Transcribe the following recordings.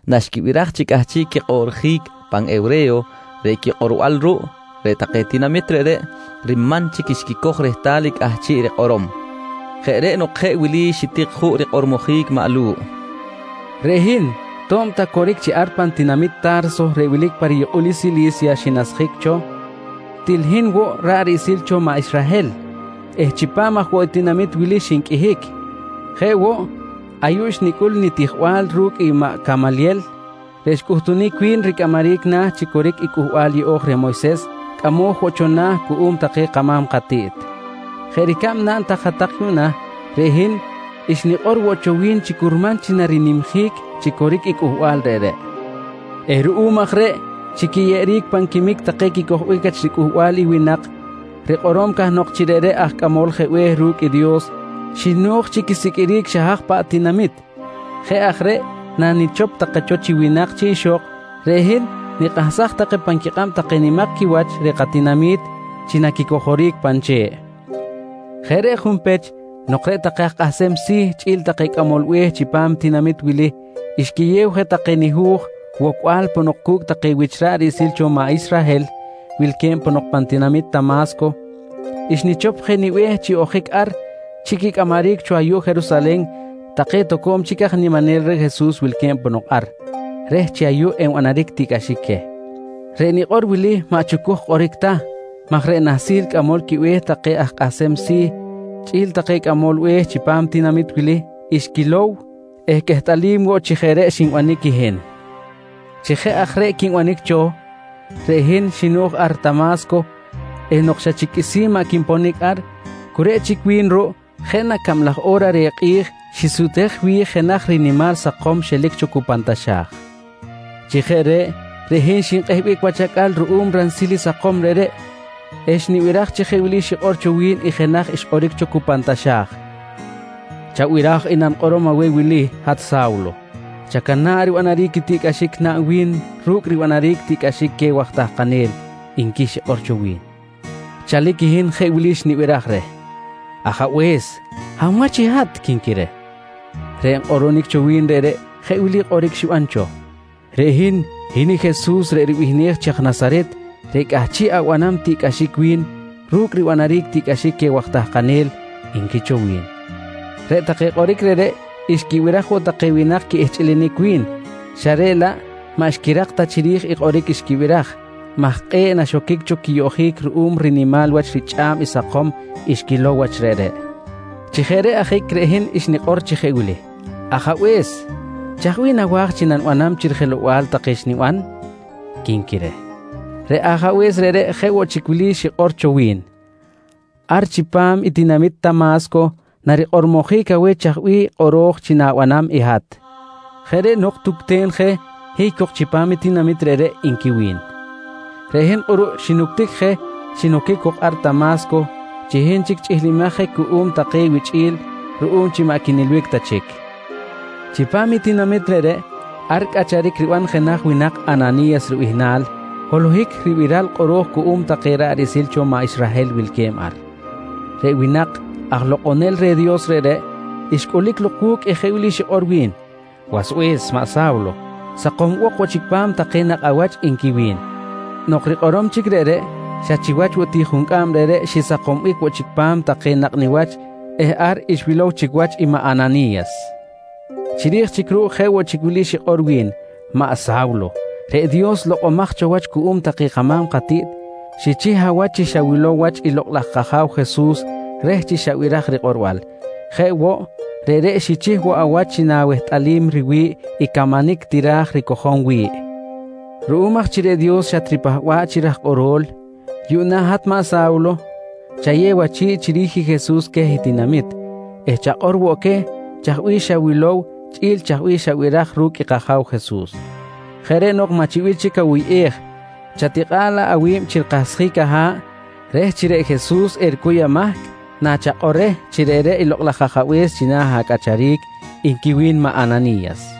Naxquibiraj chi cꞌahchiꞌ quikꞌoꞌrjic pan hewre̱yo reꞌ quikꞌorbal ruꞌ, reꞌ take tinamit reꞌreꞌ riman chic xquicoj rehtal i cꞌahchiꞌ rikꞌorom. Jeꞌ reꞌ nok jeꞌ wili xitik juꞌ rikꞌormojic maꞌ Lu̱ꞌ: «Reꞌ hin to̱b ta coric chi ar pan tinamit Ta̱rso reꞌ wilic chipam i riyukꞌul i Sili̱sya xinasjic cho, til hin woꞌ ra̱ꞌ riꞌsil cho maꞌ Israhel eh chipam aj woꞌ tinamit wili xinqꞌuihic. Jeꞌ woꞌ ayuꞌ xnicꞌul nitijbal ru̱cꞌ i maꞌ Camalyel reꞌ xcꞌuhtunic wi̱n ricꞌamaric na̱ chi coric i Cꞌuhbal Yeꞌo̱j reh Moyses reꞌ Dios cꞌamoj woꞌ cho na̱ cuꞌum take kama̱m katiꞌt. Jeꞌ ricab naꞌn hat-tak yuꞌna, reꞌ hin xnikꞌor woꞌ cho wi̱n chi curman chi narinimjic chi coric i Cꞌuhbal reꞌreꞌ eh ruꞌum aj reꞌ, chi quiyeꞌeric pan quimic take quicojbic wach ricꞌuhbal i winak rikꞌorom cahnok chi reꞌreꞌ aj Cꞌamol Be̱h je ru̱cꞌ i Dios, xino̱j chi quisiqꞌuiric xa haj paꞌ tinamit. Jeꞌ aj reꞌ nanichop take cho chi winak chi ixok, reꞌ hin nikꞌahsaj take pan quikꞌab take nimak quiwach reh katinami̱t chi naquicojoric pan che̱ꞌ. Jeꞌ reꞌ junpech, nok reꞌ take aj kꞌahsem si̱ chꞌi̱l take cꞌamol be̱h chipam tinamit wili xquiyew je take nihu̱j wocbal ponok cu̱cꞌ take wich ra̱ꞌ riꞌsil cho maꞌ Israhel wilque̱b ponok pan tinamit Tama̱sco, xnichop je nibe̱h chi ojic ar chi quicꞌamaric cho ayuꞌ Jerusalen take toco̱m chic aj niminel reh Jesus wilque̱b ponok, reh chi ayuꞌ enbanaric tiꞌcꞌaxic queh. Reꞌ nikꞌor wili maꞌ chucuj kꞌoric ta maj reꞌ nahsil cꞌamol quibe̱h take aj kꞌahsem si̱ chꞌi̱l take cꞌamol be̱h chipam tinamit wili xquilow eh quehtꞌalim woꞌ chi jeꞌ reꞌ xinbanic i hin. «Chi jeꞌ aj reꞌ quinbanic cho, reꞌ hin xino̱j ar Tama̱sco eh nok xa chic qꞌuisi̱n maꞌ quinponic ar, cu reꞌ chic wi̱n ruꞌ jeꞌ na cablaj o̱ra reh kꞌi̱j xisutej wi̱j jenaj rinimal sakom xelic cho cu pan taxa̱j. Chi jeꞌ reꞌ, reꞌ hin xinkꞌehbic wach acꞌal ruꞌum ransil i sakom reꞌreꞌ eh xnibiraj chi jeꞌ wili xikꞌor cho wi̱n i jenaj xkꞌoric cho cu pan taxa̱j: ‹Chabiraj i nanikꞌorom aweh wili hat Sa̱wlo: Chacana̱ꞌ ribanaric i tiꞌcꞌaxic naꞌn wi̱n ru̱cꞌ ribanaric tiꞌcꞌaxic queh waj tahkanel, nqui xikꞌor cho wi̱n. «Chalic i hin jeꞌ wili xnibiraj reh: ‹Ajabe̱s, hab wach i hat? quinqui reh. «Reꞌ nkꞌoꞌronic cho wi̱n reꞌreꞌ jeꞌ wili kꞌoric xiban cho: ‹Reꞌ hin, hin i Jesus reꞌ ribihnej chi aj Nasaret reꞌ cꞌahchiꞌ abanam tiꞌcꞌaxic wi̱n ru̱cꞌ ribanaric tiꞌcꞌaxic queh take waj tahkanel, nqui cho wi̱n. «Reꞌreꞌ take kꞌoric reꞌreꞌ xquibiraj woꞌ take winak quiꞌihchꞌilinic wi̱n, xa reꞌ laꞌ maꞌ xquirak ta chiri̱j i kꞌoric xquibiraj maj kꞌe̱ꞌ na xoquic cho quiyoꞌjic ruꞌum rinimal wach richꞌa̱b i sakom xquilow wach reꞌreꞌ. Chi jeꞌ reꞌ ajic reꞌ hin xnikꞌor chi jeꞌ wili: ‹Ajabe̱s, chaj bih nawa̱j chi nanibanam chi rijelow-bal take xniban? quinqui reh. «Reꞌ Ajabe̱s reꞌreꞌ jeꞌ woꞌ chic wili xikꞌor cho wi̱n: ‹Ar chipam i tinamit Tama̱sco narikꞌormojic aweh chaj bih kꞌoro̱j chi na̱banam i hat. Jeꞌ reꞌ nok tucten je, hiy cok chipam tinamit reꞌreꞌ, nqui wi̱n. «Reꞌ hin kꞌuruꞌ xinuctic je, xinoquic cok ar Tama̱sco chi hin chic chꞌihlimaj je cuꞌum take wichꞌi̱l ruꞌum chi maꞌ quinilbic ta chic. Chipam i tinamit reꞌreꞌ, ar cꞌacharic riban jenaj winak Anani̱yas ribihnal holohic ribiral kꞌoro̱j cuꞌum take ra̱ꞌ riꞌsil cho maꞌ Israhel wilque̱b ar. Reꞌ winak aj lokꞌonel reh Dios reꞌreꞌ, xcꞌulic lok wu̱cꞌ eh jeꞌ wili xikꞌor wi̱n: ‹Wasbe̱s maꞌ Sa̱wlo, sakombok woꞌ chic pa̱m take nakꞌ awach, nqui wi̱n. «Nok rikꞌorom chic reꞌreꞌ, xa chiwach woꞌ ti juncꞌam reꞌreꞌ xisakombic woꞌ chic pa̱m take nakꞌ niwach eh ar xwilow chic wach i maꞌ Anani̱yas. Chiri̱j chic ruꞌ jeꞌ woꞌ chic wili xikꞌor wi̱n: ‹Maꞌ Sa̱wlo, reꞌ Dios lokꞌomaj cho wach cuꞌum take kama̱m katiꞌt xichih awach chi xawilow wach i Lokꞌ laj kAja̱w Jesus reh chi xabiraj rikꞌorbal. Jeꞌ woꞌ, reꞌreꞌ xichih woꞌ awach chi nawehtꞌalim riwi̱ꞌ i camanic tira̱j ricojom wi̱ꞌ. Ruꞌum aj chi reꞌ Dios xatripahba̱ꞌ chi raj kꞌorol, yuꞌna hat maꞌ Sa̱wlo chayew achi̱ꞌ chiri̱j i Jesus queh i tinamit eh chakꞌor woꞌ queh chaj bih xawilow chꞌi̱l chaj bih xabiraj ru̱cꞌ kAja̱w Jesus. Jeꞌ reꞌ nok maꞌ chi bih chic awuyꞌej, chatikꞌa̱ꞌ laꞌ awi̱b chi rikahsjic aha̱ꞌ reh chi reꞌ Jesus ericuy amahc nachakꞌor reh chi reꞌreꞌ i Lokꞌ laj Ajabe̱s china̱ acꞌacharic, nqui wi̱n maꞌ Anani̱yas.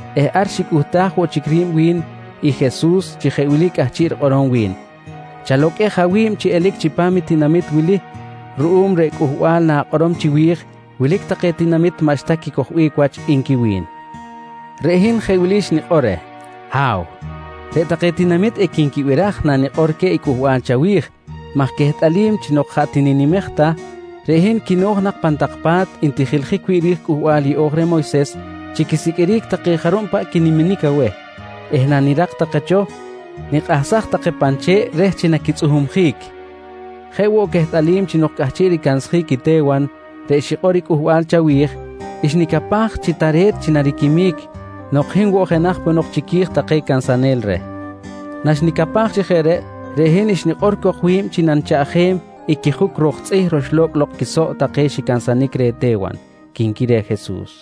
eh ar xicꞌuhtaj woꞌ chic ri̱b wi̱n i Jesus chi jeꞌ wili cꞌahchiꞌ rikꞌorom wi̱n: ‹Chaloqꞌuej awi̱b chi elic chipam i tinamit wili ruꞌum reꞌ cꞌuhbal na̱kꞌorom chiwi̱j wilic take tinamit maꞌxta quicojbic wach, nqui wi̱n. «Reꞌ hin jeꞌ wili xnikꞌor reh: ‹Ha̱w, reꞌ take tinamit equinquibiraj nanikꞌor queh i cꞌuhbal chawi̱j maj quehtꞌalim chi nok jaꞌ tininimej ta, reꞌ hin quino̱j nak pan tak pa̱t ntijiljic wi̱ꞌ ri̱j i Cꞌuhbal Yeꞌo̱j reh Moyses chi quisiqꞌuiric take jarub paꞌ quiniminic aweh eh nanirak take cho, nikꞌahsaj take pan che̱ꞌ reh chi naquitzꞌuhumjic. Jeꞌ woꞌ quehtꞌalim chi nok cꞌahchiꞌ ricansjic i Te̱wan reꞌ xikꞌor i cꞌuhbal chawi̱j, xnicapaj chi tare̱t chi nariquimic nok hin woꞌ jenaj ponok chiqui̱j take cansanel reh. Naxnicapaj chi jeꞌ reꞌ, reꞌ hin xnikꞌor cok wi̱b chi nanichaꞌjem i quijuc ro̱k tzꞌih roxlo̱cꞌ lok quisoꞌ take xicansanic reh Te̱wan, quinqui reh Jesus.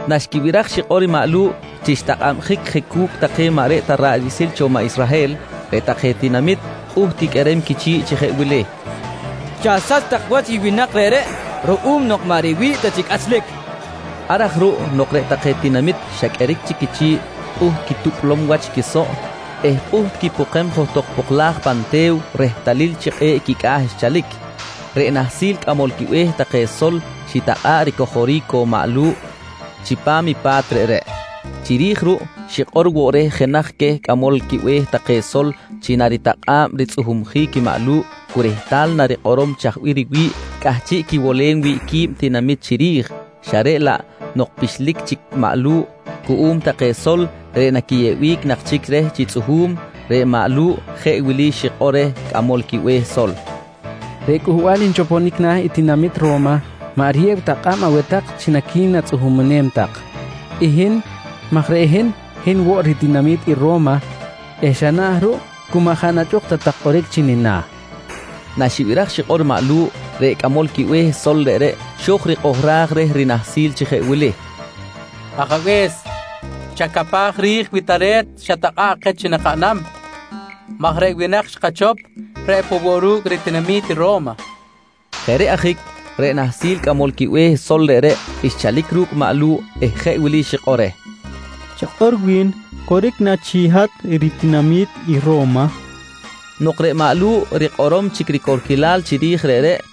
Naxquibiraj i xikꞌor maꞌ Lu̱ꞌ chi xtakꞌabjic je cu̱cꞌ take maꞌ reꞌ ta ra̱ꞌ riꞌsil cho maꞌ Israhel, reꞌ take tinamit pꞌuht quiqꞌuerem quichi̱ꞌ chi jeꞌ wili: «Chasach tak wach i winak reꞌreꞌ ruꞌum nok maꞌ riwi̱ꞌ ta chi cꞌachlic, nqui take. Ar aj ruꞌ nok reꞌ take tinamit xa qꞌueric chic quichi̱ꞌ pꞌuht quitupꞌlom wach i quisoꞌ eh pꞌuht quipokem johtok poklaj pan te̱w rehtalil chi kꞌe̱ꞌ quicꞌa̱ xchalic, reꞌ nahsil cꞌamol quibe̱h take sol xitakꞌa̱ꞌ ricojoric cok maꞌ Lu̱ꞌ chipam i pa̱t reꞌreꞌ. Chiri̱j ruꞌ xikꞌor woꞌ reh jenaj queh cꞌamol quibe̱h take sol chi naritakꞌa̱b ritzꞌuhumjic i maꞌ Lu̱ꞌ cu rehtal narikꞌorom chaj bih riwi̱ꞌ cꞌahchiꞌ quiwolem wi̱ꞌ qui̱b tinamit chiri̱j xa reꞌ laꞌ nok pixlic chic maꞌ Lu̱ꞌ cuꞌum take sol reꞌ naquiyeꞌbic nak chic reh chi tzꞌuhu̱m, reꞌ maꞌ Lu̱ꞌ jeꞌ wili xikꞌor reh cꞌamol quibe̱h sol: «Reꞌ cꞌuhbal nchoponic na̱ i tinamit Ro̱ma maꞌ riyew ta kꞌab aweh tak chi naqui̱natzꞌuhumem tak i hin maj reꞌ hin, hin woꞌ ritinami̱t i Ro̱ma eh xa na̱ ruꞌ cu maꞌ jaꞌ nachꞌuk ta tak kꞌoric chi nina̱, nqui maꞌ Lu̱ꞌ. Naxibiraj xikꞌor maꞌ Lu̱ꞌ, reꞌ cꞌamol quibe̱h sol reꞌreꞌ xo̱j rikꞌohraj reh rinahsi̱l chi jeꞌ wili: «Ajabe̱s, chacapaj ri̱j wi tare̱t i xatakꞌa̱ꞌ keh chi nakaꞌnam maj reꞌ winak xkachop reꞌ poꞌ woꞌ ru̱cꞌ ritinami̱t i Ro̱ma, nqui xikꞌor reh. Jeꞌ reꞌ ajic reꞌ nahsil cꞌamol quibe̱h sol reꞌreꞌ xchalic ru̱cꞌ maꞌ Lu̱ꞌ eh jeꞌ wili xikꞌor reh: «Chakꞌor wi̱n, coric na chi hat ritinami̱t i Ro̱ma? nqui xikꞌor reh. Nok reꞌ maꞌ Lu̱ꞌ rikꞌorom ricorquilal chiri̱j reꞌreꞌ,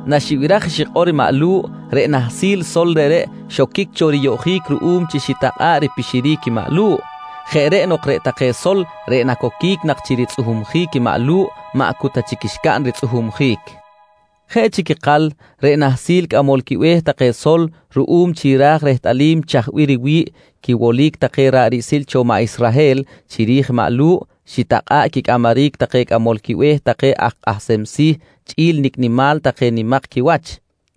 Naxibiraj i xikꞌor maꞌ Lu̱ꞌ, reꞌ nahsil sol reꞌreꞌ xoquic cho riyoꞌjic ruꞌum chi xitakꞌa̱ꞌ ripixiric i maꞌ Lu̱ꞌ. Jeꞌ reꞌ nok, reꞌ take sol reꞌ nacoquic nak chi ritzꞌuhumjic i maꞌ Lu̱ꞌ, maꞌ cu ta chic xcaꞌn ritzꞌuhumjic. Jeꞌ chic ikal reꞌ nahsil cꞌamol quibe̱h take sol, ruꞌum chi raj rehtꞌalim chaj bih riwi̱ꞌ quiwolic take ra̱ꞌ riꞌsil cho maꞌ Israhel chiri̱j maꞌ Lu̱ꞌ, xitakꞌa̱ꞌ quicꞌamaric take cꞌamol quibe̱h take aj kꞌahsem si̱ chꞌi̱l nicꞌ nimal take nimak quiwach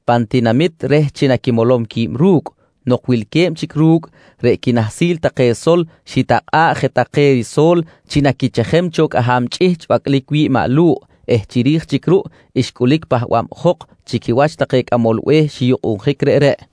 pan tinamit reh chi naquimolom qui̱b ru̱cꞌ. Nok wilque̱b chic ru̱cꞌ, reꞌ quinahsil take sol xitakꞌa̱ꞌ je take riso̱l chi naquichejem cho cꞌaham chꞌihchꞌ bacꞌlic wi̱ꞌ maꞌ Lu̱ꞌ eh chiri̱j chic ruꞌ, xcꞌulic pahbabjok chi quiwach take cꞌamol be̱h xiyukꞌunjic reꞌreꞌ.